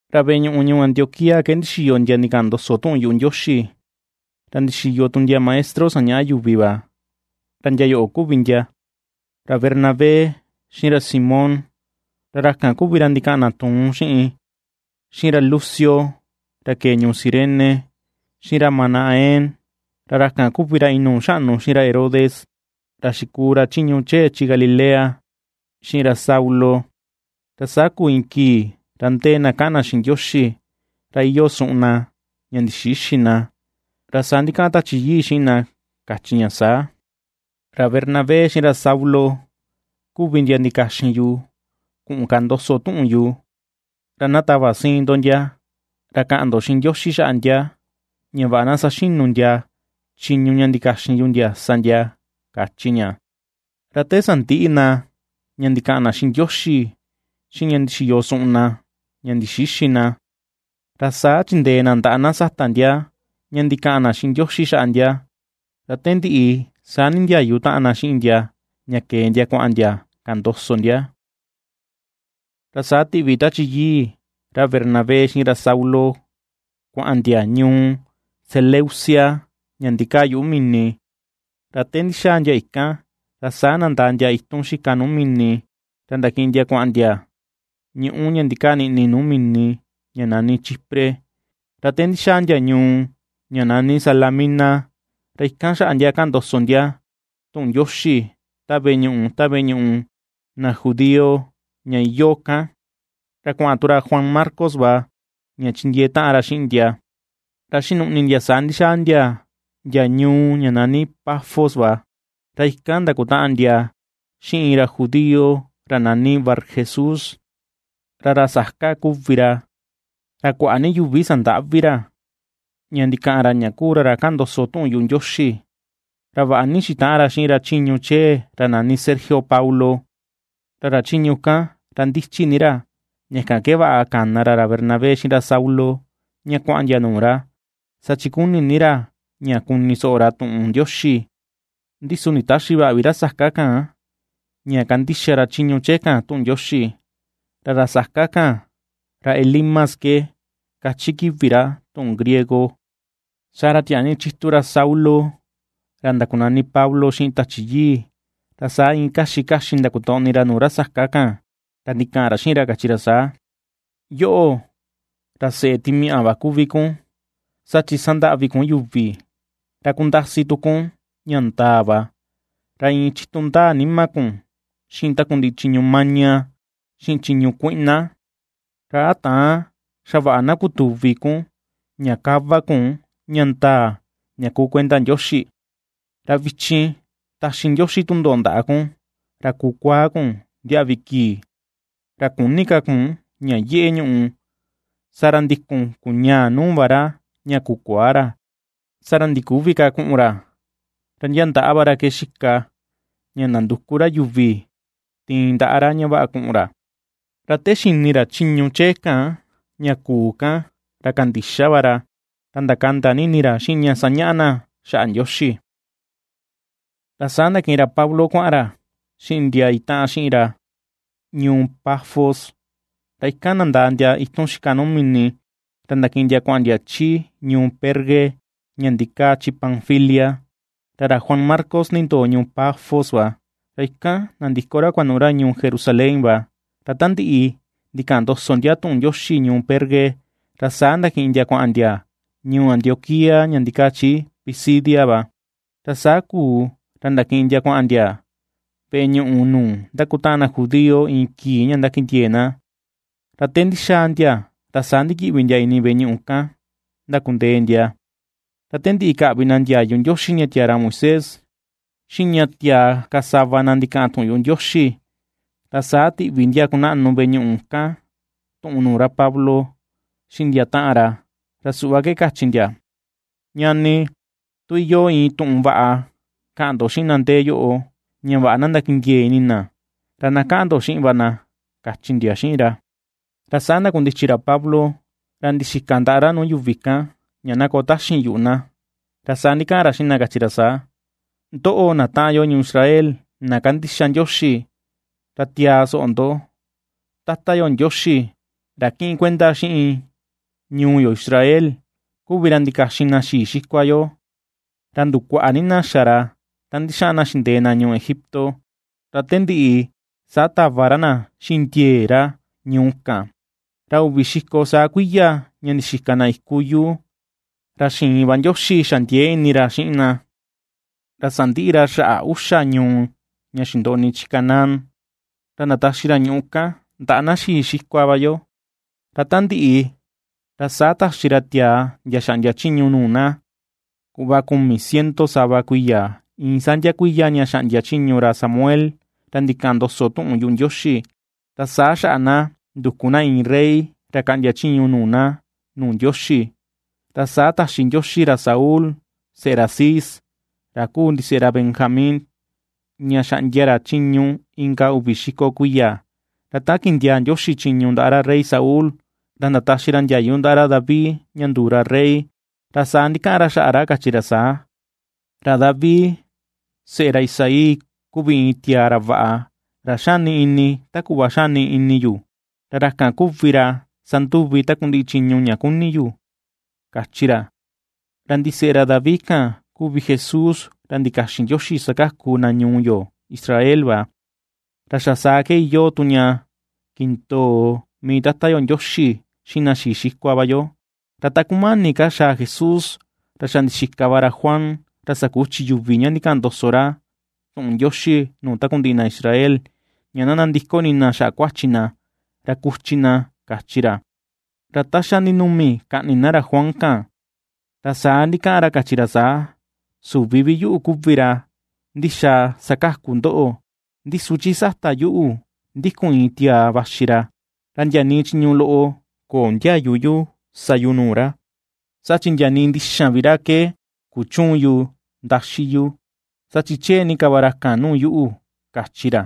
Ra veꞌe ñuꞌu ñuu Antioquía ke ndixiyo ndia ndikaꞌan ndoso tuꞌun yuꞌu Ndioxi, ra ndixiyo tu ndia maestro sañaꞌa yuvi va, Ra ndia yoꞌo kuvi ndia: ra Bernabé, xiꞌin ra Simón (ra ra kan kuvi ra ndikaꞌan na ra tuun xiꞌin), xiꞌin ra Lucio ra kee ñuu Cirene, xiꞌin ra Manaén (ra ra kan kuvi ra inuu xaꞌnu xiꞌin ra Herodes, ra xikuu ra chiñu chee chi Galilea), xiꞌin ra Saulo. Ra saa kuu iin kii ra ndee na kaꞌan na xiꞌin Ndioxi, ra iyoo suꞌun na ña ndixïxi na, ra saa ndikaꞌan Tachi Yii xiꞌin na kachi ña saa: ―Ra Bernabé xiꞌin ra Saulo, kuvi ndia ndikaxin yu kuꞌun kaꞌan ndoso tuꞌun yu, ra na tava siin ndo ndia, ra kaꞌan ndo xiꞌin Ndioxi xaꞌa ndia ña vaꞌa na saxinu ndia chiñu ña ndikaxin yu ndia sa ndia ―kachi ña. Ra te sandiꞌi na ña ndikaꞌan na xiꞌin Ndioxi xiꞌin ña ndixiyo suꞌun na ña ndixïxi na, ra saa chindee na ndaꞌa na sata ndia ña ndikaꞌan na xiꞌin Ndioxi xaꞌa ndia. Ra te ndiꞌi saa nindiayu taꞌan na xiꞌin ndia ña kee ndia kuaꞌan ndia kaꞌan ndoso ndia. Ra saa tiꞌvi Tachi Yii, ra Bernabé xiꞌin ra Saulo, kuaꞌan ndia ñuu Seleucia ña ndikaa yuꞌu mini, ra te ndixaa ndia ikan ra saa nandaa ndia itun xika nuu mini ra ndakiꞌin ndia kuaꞌan ndia ñuꞌú ña ndikaa niꞌni nuu mini ña nani Chipre. Ra te ndixaa ndia ñuu ña nani Salamina, ra ikan xaꞌa ndia kaꞌan ndoso ndia tuꞌun Ndioxi ta veꞌe ñuꞌu, ta veꞌe ñuꞌu na judío ña iyoo kan. Ra kuaꞌan tu ra Juan Marcos va ña chindiee taꞌan ra xiꞌin ndia. Ra xinuꞌni ndia saa ndixaa ndia, ndia ñuu ña nani Pafos va. Ra ikan ndakutaꞌan ndia xiꞌin iin ra judío ra nani Barjesús, ra ra saka kuvi ra. Ra kuaꞌa ni yuvi sandaꞌvi ra, ña ndikaꞌan ra ña kuu ra ra kaꞌan ndoso tuꞌun yuꞌu Ndioxi. Ra vaꞌa ni xitaꞌan ra xiꞌin ra chiñu chee ra nani Sergio Paulo, ra ra chiñu kan ra ndichi ni ra, ña kan ke vaꞌa kana ra ra Bernabé xiꞌin ra Saulo ña kuaꞌan ndia nuu ra, saa chi kuni ni ra ña kuni soꞌo ra tuꞌun Ndioxi. Ndi su nditäxi vaꞌa vi ra saka kan ña kandixa ra chiñu chee kan tuꞌun Ndioxi. Ra ra saka kan, ra Elimas ke kachi kivi ra tuꞌun griego. Saa ra tiaa ni chitu ra ra Saulo ra ndakunani Pablo xiꞌin Tachi Yii, ra saa iin kaxi kaxi ndakotoꞌni ra nuu ra saka kan, ra ndikaꞌan ra xiꞌin ra, kachi ra saa: ―¡Yoꞌo, ra seꞌe timiaꞌa va kuvi kun, saa chi sandaꞌvi kun yuvi, ra kundasi tu kun ña ndaa va, ra iin chitu ndaa nima kun xiꞌin takundiꞌi chiñu maña, xiꞌin chiñu kuiꞌna! ¿Ra a täan xa vaꞌa na kutuvi kun ña kava kun ña ndaa ña kuu kuenda Ndioxi? Ra vichin taxi Ndioxi tundoꞌo ndaꞌa kun ra kukuaa kun ndiaꞌvi kii, ra küni ka kun ña yeꞌe ñuꞌu. Saa ra ndikun kuñaa nuu va ra ña kukuaa ra, saa ra ndiküvi ka kuꞌun ra, ra ndia ndaꞌa va ra ke xika ña ndanduku ra yuvi tiin ndaꞌa ra ña vaꞌa kuꞌun ra. Ra te xini ra chiñu chee ka ña kuu kan, ra kandixa va ra, ra ndakanda ni ini ra xiꞌin ña sañaꞌa na xaꞌa Ndioxi. Ra saa ndakiꞌin ra Pablo kuaꞌan ra xiꞌin ndia itaꞌan xiꞌin ra ñuu Pafos ra ikan ndandaa ndia itun xika nuu mini, ra ndakiꞌin ndia kuaꞌan ndia chi ñuu Perge ña ndikaa chi Panfilia. Ra ra Juan Marcos nindoo ñuu Pafos va, ra ikan nandiko ra kuanuꞌu ra ñuu Jerusalén va. Ra ta ndiꞌi ndikaꞌan ndoso ndia tuꞌun Ndioxi ñuu Perge, ra saa ndakiꞌin ndia kuaꞌan ndia ñuu Antioquía ña ndikaa chi Pisidia va. Ra saa kuu ra ndakiꞌin ndia kuaꞌan ndia veꞌe ñuꞌu nuu ndakutaꞌan na judío iin kii ña ndakindiee na, ra te ndixaa ndia ra saa ndikiꞌvi ndia ini veꞌe ñuꞌu kan ndakundee ndia. Ra te ndiꞌi kaꞌvi na ndiayu Ndioxi ña tiaa ra Moisés, xiꞌin ña tiaa na ka sava na ndikaꞌan tuꞌun yuꞌu Ndioxi, ra saa tiꞌvi ndia kunaꞌnu veꞌe ñuꞌu kan tuꞌun nuu ra Pablo xiꞌin ndia taꞌan ra, ra suꞌva ke kachi ndia: ―Ñani, tu iyoo iin tuꞌun vaꞌa kaꞌan ndo xiꞌin na ndee yoꞌo ña vaꞌa na ndakindiee ini na, ra na kaꞌan ndo xiꞌin va na ―kachi ndia xiꞌin ra. Ra saa ndakundichi ra Pablo ra ndixika ndaꞌa ra nuu yuvi kan ña na koo taxin yuꞌu na. Ra saa ndikaꞌan ra xiꞌin na kachi ra saa: ―Ndoꞌo, na taꞌan yo ñuu Israel, na kandixa Ndioxi, ra tiaa soꞌo ndo. Tata yo Ndioxi, ra ^kiꞌin kuenda xiꞌin ñuu yo Israel, kuvi ra ndikaxin na xii xikua yo, ra ndukuaꞌa ni na xa ra ta ndixaꞌan na xindee na ñuu Egipto, ra te ndiꞌi saa tava ra na xiꞌin ndiee ra ñuu kan. Ra uvi xiko saa kuiya ña ndixika na iku yuu, ra xïin va Ndioxi xa ndiee ini ra xiꞌin na. Ra sandiꞌi ra xaꞌa uxa ñuu ña xindoꞌni chi Canaán, ra ndataxi ra ñuꞌu kan ndaꞌa na xii xikua va yo. Ra ta ndiꞌi, ra saa taxi ra tiaa ndia xaꞌndia chiñu nuu na, kuꞌva kumi ciento sava kuiya, iin saa ndia kuiya ña xaꞌndia chiñu ra Samuel ra ndikaꞌan ndoso tuꞌun yuꞌu Ndioxi. Ra saa xaꞌa na nduku na iin rey ra kaꞌndia chiñu nuu na nuu Ndioxi, ra saa taxi Ndioxi ra Saúl, seꞌe ra Cis, ra kuu ndiseꞌe ra Benjamín, ña xaꞌndia ra chiñu inka uvi xiko kuiya. Ra ta kindiaa Ndioxi chiñu ndaꞌa ra rey Saúl, ra ndataxi ra ndiayu ndaꞌa ra David ña nduu ra rey, ra saa ndikaꞌan ra xaꞌa ra, kachi ra saa: “Ra David, seꞌe ra Isaí, kuvi iin tiaa ra vaꞌa, ra xani ini ta kuꞌva xani ini yu, ra ra kan kuvi ra sanduvi takundiꞌi chiñu ña kuni yu”, kachi ra. Ra ndiseꞌe ra David kan kuvi Jesús ra ndikaxin Ndioxi sakaku na ñuu yo Israel va. Ra xa saa ke iyoo tu ña kindoo mii Tata yo Ndioxi xiꞌin na xii xikua va yo. Ra ta kumani ka xaa Jesús, ra xa ndixika va ra Juan ra sakuchi yuvi ña ndikaꞌan ndoso ra tuꞌun Ndioxi nuu takundiꞌi na Israel, ña na nandiko ini na xaꞌa kuachi na, ra kuchi na, kachi ra. Ra ta xa ndinumi kaꞌni na ra Juan kan, ra saa ndikaꞌan ra kachi ra saa: “Süvi vi yuꞌu kuvi ra ndixaa sakaku ndoꞌo, ndi su chi sata yuꞌu ndikun iin tiaa vaxi ra, ra ndia nii chiñu loꞌo köo ndiayu yu sa yu nuu ra, saa chi ndia nii ndixan vi ra ke kuchüun yu ndaxi yu, saa chi chee ni ka va ra kan nuu yuꞌu”, kachi ra.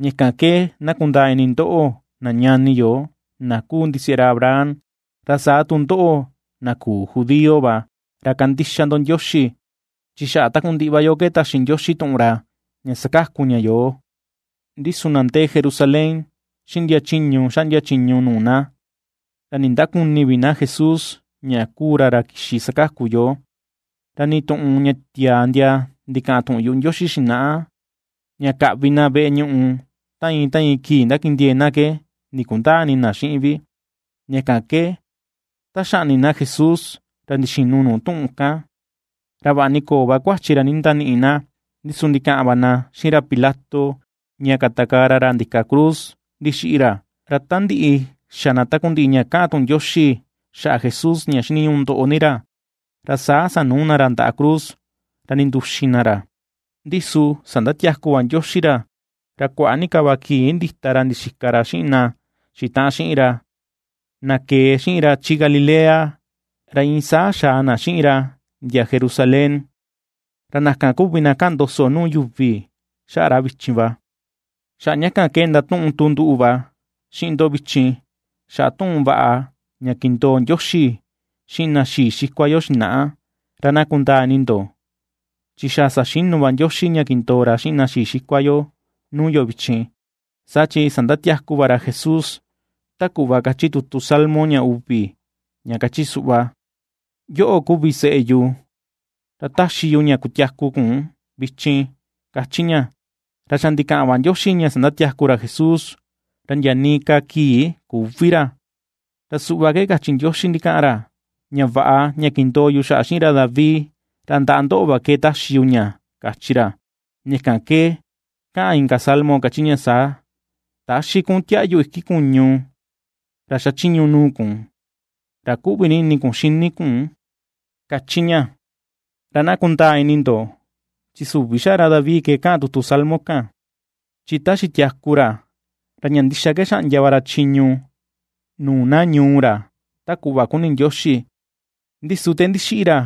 ’Ña kan ke na kundaa ini ndoꞌo, na ñani yo, na kuu ndiseꞌe ra Abraham, ra saa tu ndoꞌo, na küu judío va ra kandixa ndo Ndioxi, chi xaꞌa takundiꞌi va yo ke taxi Ndioxi tuꞌun ra ña sakaku ña yoo. Ndi su na ndee Jerusalén xiꞌin ndia chiñu xaꞌndia chiñu nuu na, ra ndindaküni vi na Jesús ña kuu ra ra kixi sakaku yoo, ra nii tuꞌun ña tiaa ndia ndikaꞌan tuꞌun yuꞌu Ndioxi xinaꞌa, ña kaꞌvi na veꞌe ñuꞌu ta iin ta iin kii ndakindiee na ke ndikundäa ini na xiꞌin vi; ña kan ke ta xaꞌni na Jesús ra ndixinu nuu tuꞌun kan. Ra vaꞌa ni köo va kuachi ra ndindaniꞌi na, ndi su ndikaꞌan va na xiꞌin ra Pilato ña katakaa ra ra ndika cruz ndixiꞌi ra. Ra ta ndiꞌi xa na takundiꞌi ña kaꞌan tuꞌun Ndioxi xaꞌa Jesús ña xiniñuꞌu ndoꞌo ni ra, ra saa sanuu na ra ndaꞌa cruz ra ndinduxin na ra. Ndi su sandatiaku va Ndioxi ra. Ra kuaꞌa ni ka va kii ndita ra ndixika ra xiꞌin na xitaꞌan xiꞌin ra, na kee xiꞌin ra chi Galilea ra iin saa xaa na xiꞌin ra ndia Jerusalén. Ra na kan kuvi na kaꞌan ndoso nuu yuvi xaꞌa ra vichin va. ’Xaꞌa ña kan ke ndatuꞌun tu nduꞌu va xiꞌin ndo vichin, xaꞌa tuꞌun vaꞌa, ña kindoo Ndioxi xiꞌin na xii xikua yo xinaꞌa. Ra na kundaa ini ndo chi xa saxinu va Ndioxi ña kindoo ra xiꞌin na xii xikua yo nuu yo vichin, saa chi sandatiaku va ra Jesús, ta kuꞌva kachi tutu salmo ña uvi ña kachi suꞌva: “Yoꞌo kuvi seꞌe yu, ra taxi yu ña kutiaku kun vichin”, kachi ña. Ra xa ndikaꞌan va Ndioxi ña sandatiaku ra Jesús, ra ndia nii ka kii küvi ra. Ra suꞌva ke kachi Ndioxi ndikaꞌan ra: “Ña vaꞌa ña kindoo yu xaꞌa xiꞌin ra David, ra ndaꞌa ndoꞌo va ke taxi yu ña”, kachi ra. Ña kan ke kaꞌan inka salmo kachi ña saa: “Täxi kun tiaꞌyu iki kuñu, ra xachiñu nuu kun, ra kuꞌvi ni ini kun xini kun”, kachi ña. Ra na kundaa ini ndo, chi süvi xaꞌa ra David ke kaꞌan tutu salmo kan. Chi ta xitiaku ra, ra ña ndixa ke xaꞌndia va ra chiñu nuu na ñuu ra ta kuꞌva kuni Ndioxi, ndi su te ndixiꞌi ra,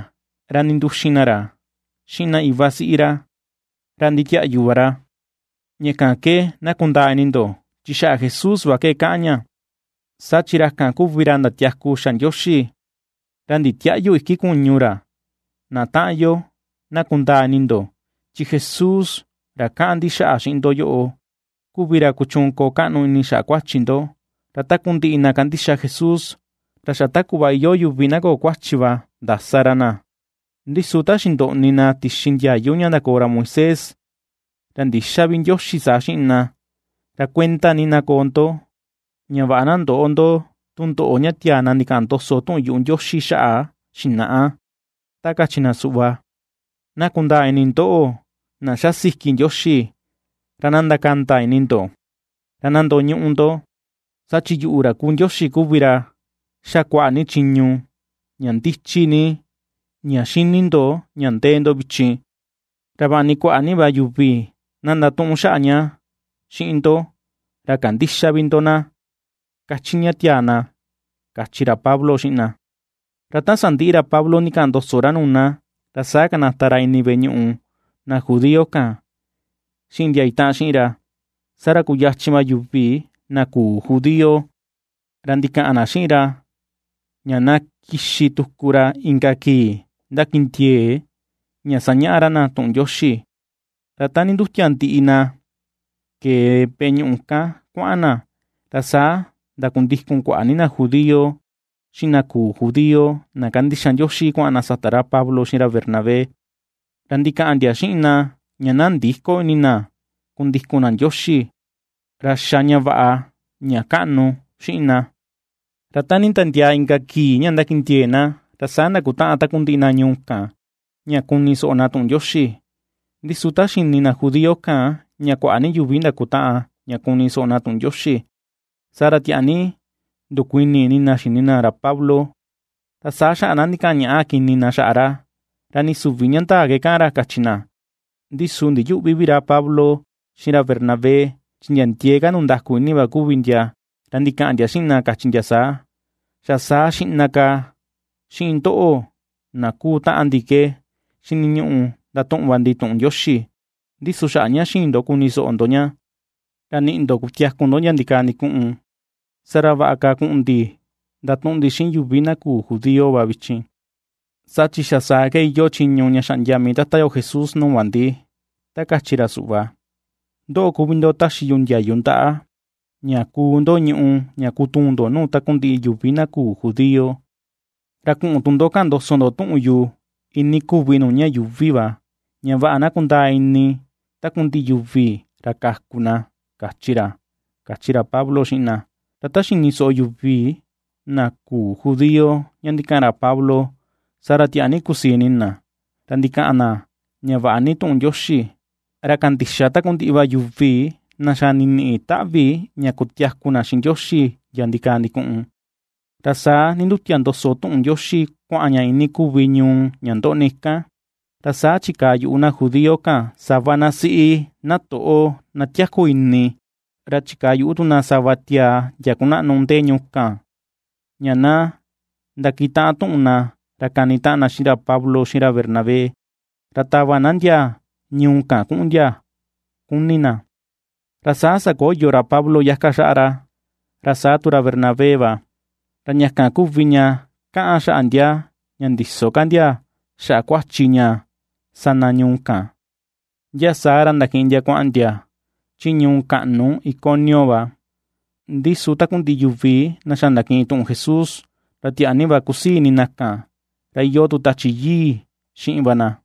ra ninduxin na ra xiꞌin na iva siꞌi ra, ra nditiaꞌyu va ra. Ña kan ke na kundaa ini ndo, chi xaꞌa Jesús va ke kaꞌan ña, saa chi ra kan kuvi ra ndatiaku xa Ndioxi, ra nditiäꞌyu iki kuñu ra. Na taꞌan yo, na kundaa ini ndo, chi Jesús ra kaꞌan ndi xaꞌa xiꞌin ndo yoꞌo, kuvi ra kuchuun koo kaꞌnu ini xaꞌa kuachi ndo. Ra takundiꞌi na kandixa Jesús, ra xa ta kuꞌva iyoo yuvi na köo kuachi va ndasa ra na, ndi su ta xindoꞌni na tixi ndiayu ña ndakoo ra Moisés ra ndïxa vi Ndioxi saa xiꞌin na. Ra kuenda ni na koo ndo, ña vaꞌa na ndöꞌo ndo tundoꞌo ña tiaa na ndikaꞌan ndoso tuꞌun yuꞌu Ndioxi xaꞌa xinaꞌa, ta kachi na suꞌva: Na kundaa ini ndóꞌo̱, na ^xa siki Ndioxi, ra na ndakanda ini ndo, ra na ndoñuꞌu ndo; Saa chi yuꞌu ra kuu Ndioxi kuvi ra ^xa kuaꞌa ni chiñu ña ndichi ni ña xini ndo ña ndee ndo vichin, ra vaꞌa ni kuaꞌa ni va yuvi na ndatuꞌun xaꞌa ña xiꞌin ndo, ra kandïxa vi ndo na, kachi ña tiaa na ―kachi ra Pablo xiꞌin na. Ra ta sandiꞌi ra Pablo ndikaꞌan ndoso ra nuu na, ra saa kanata ra ini veꞌe ñuꞌu na judío kan xiꞌin ndia itaꞌan xiꞌin ra. Saa ra kuyachin va yuvi na küu judío ra ndikaꞌan na xiꞌin ra ña na kixi tuku ra inka kii ndakindiee ña sañaꞌa ra na tuꞌun Ndioxi. Ra ta nindutia ndiꞌi na kee veꞌe ñuꞌu kan kuaꞌan na, ra saa ndakundikun kuaꞌa ni na judío, xiꞌin na küu judío na kandixa Ndioxi kuaꞌan na sata ra Pablo xiꞌin ra Bernabé. Ra ndikaꞌan ndia xiꞌin na ña na ndïko ini na kundikun na Ndioxi, ra xá ña vaꞌa ña kaꞌnu xiꞌin na. Ra ta nditiandiaa inka kii ña ndakindiee na, ra saa ndakutaꞌan takundiꞌi na ñuu kan ña kuni soꞌo na tuꞌun Ndioxi. Ndi su ta xini na judío kan ña kuaꞌa ni yuvi ndakutaꞌan ña kuni soꞌo na tuꞌun Ndioxi, saa ra tiaa ni ndukuini ini na xini na ra Pablo, Ra saa xaꞌa na ndikaꞌan ñaꞌa kini na xaꞌa ra, ra ni süvi ña ndaa ke kaꞌan ra, kachi na. Ndi su ndiyüꞌvi vi ra Pablo xiꞌin ra Bernabé, chi ndia ndiee ka ndundaku ini va kuvi ndia, ra ndikaꞌan ndia xiꞌin na, kachi ndia saa: ―Xa saa xiꞌna ka xiꞌin ndoꞌo, na kuu taꞌan ndi ke xiniñuꞌu ndatuꞌun va ndi tuꞌun Ndioxi, ndi su xaꞌa ña xïin ndo kuni soꞌo ndo ña, ra nïꞌi ndo kutiaku ndo ndia ndikaa ndikuꞌun, saa ra vaꞌa ka na kuꞌun ndi ndatuꞌun ndi xiꞌin yuvi na küu judío va vichin. Saa chi xa saa ke iyoo chiñu ña xaꞌndia mii Tata yo Jesús nuu va ndi, ta kachi ra suꞌva: Ndoꞌo kuvi ndo taxi yu ndiayu ndaꞌa, ña kuu ndo ñùꞌù ña kutuun ndo nuu takundiꞌi yuvi na küu judío, Ra kuꞌun tu ndo kaꞌan ndoso ndo tuꞌun yu, iinii kuvi nuu ña yuuvi ña vaꞌa na kundaa ini takundiꞌi yuvi ra kaku na, kachi ra ―kachi ra Pablo xiꞌin na. Ra ta xini soꞌo yuvi na küu judío ña ndikaꞌan ra Pablo, saa ra tiaa ni kusii ini na, ra ndikaꞌan na ña vaꞌa ni tuꞌun Ndioxi; ra kandixa takundiꞌi va yuvi na xa niniꞌi taꞌvi ña kutiaku na xiꞌin Ndioxi ndia ndikaa ndikuꞌun. Ra saa ndindutia ndoso tuꞌun Ndioxi kuaꞌan ña iinii kuvi ñuu ña ndoꞌni kan. Ra saa chikaa yuꞌu na judío kan, sava na siꞌi, na toꞌo, na tiaku ini, ra chikaa yuꞌu tu na sava tiaa ndia kunaꞌnu ndee ñuu kan, ña na ndakitaꞌan tuꞌun na ra kanitaꞌan na xiꞌin ra Pablo xiꞌin ra Bernabé, ra tava na ndia ñuu kan kuꞌun ndia kuni na. Ra saa sakoyo ra Pablo yaka xaꞌa ra, ra saa tu ra Bernabé va, ra ña kan kuvi ña kaꞌan xaꞌa ndia ña ndïso ka ndia xaꞌa kuachi ña sa na ñuu kan, ndia saa ra ndakiꞌin ndia kuaꞌan ndia chi ñuu kaꞌnu Iconio va. Ndi su takundiꞌi yuvi na xa ndakiꞌin tuꞌun Jesús, ra tiaa ni va kusii ini na kan, ra iyoo tu Tachi Yii xiꞌin va na.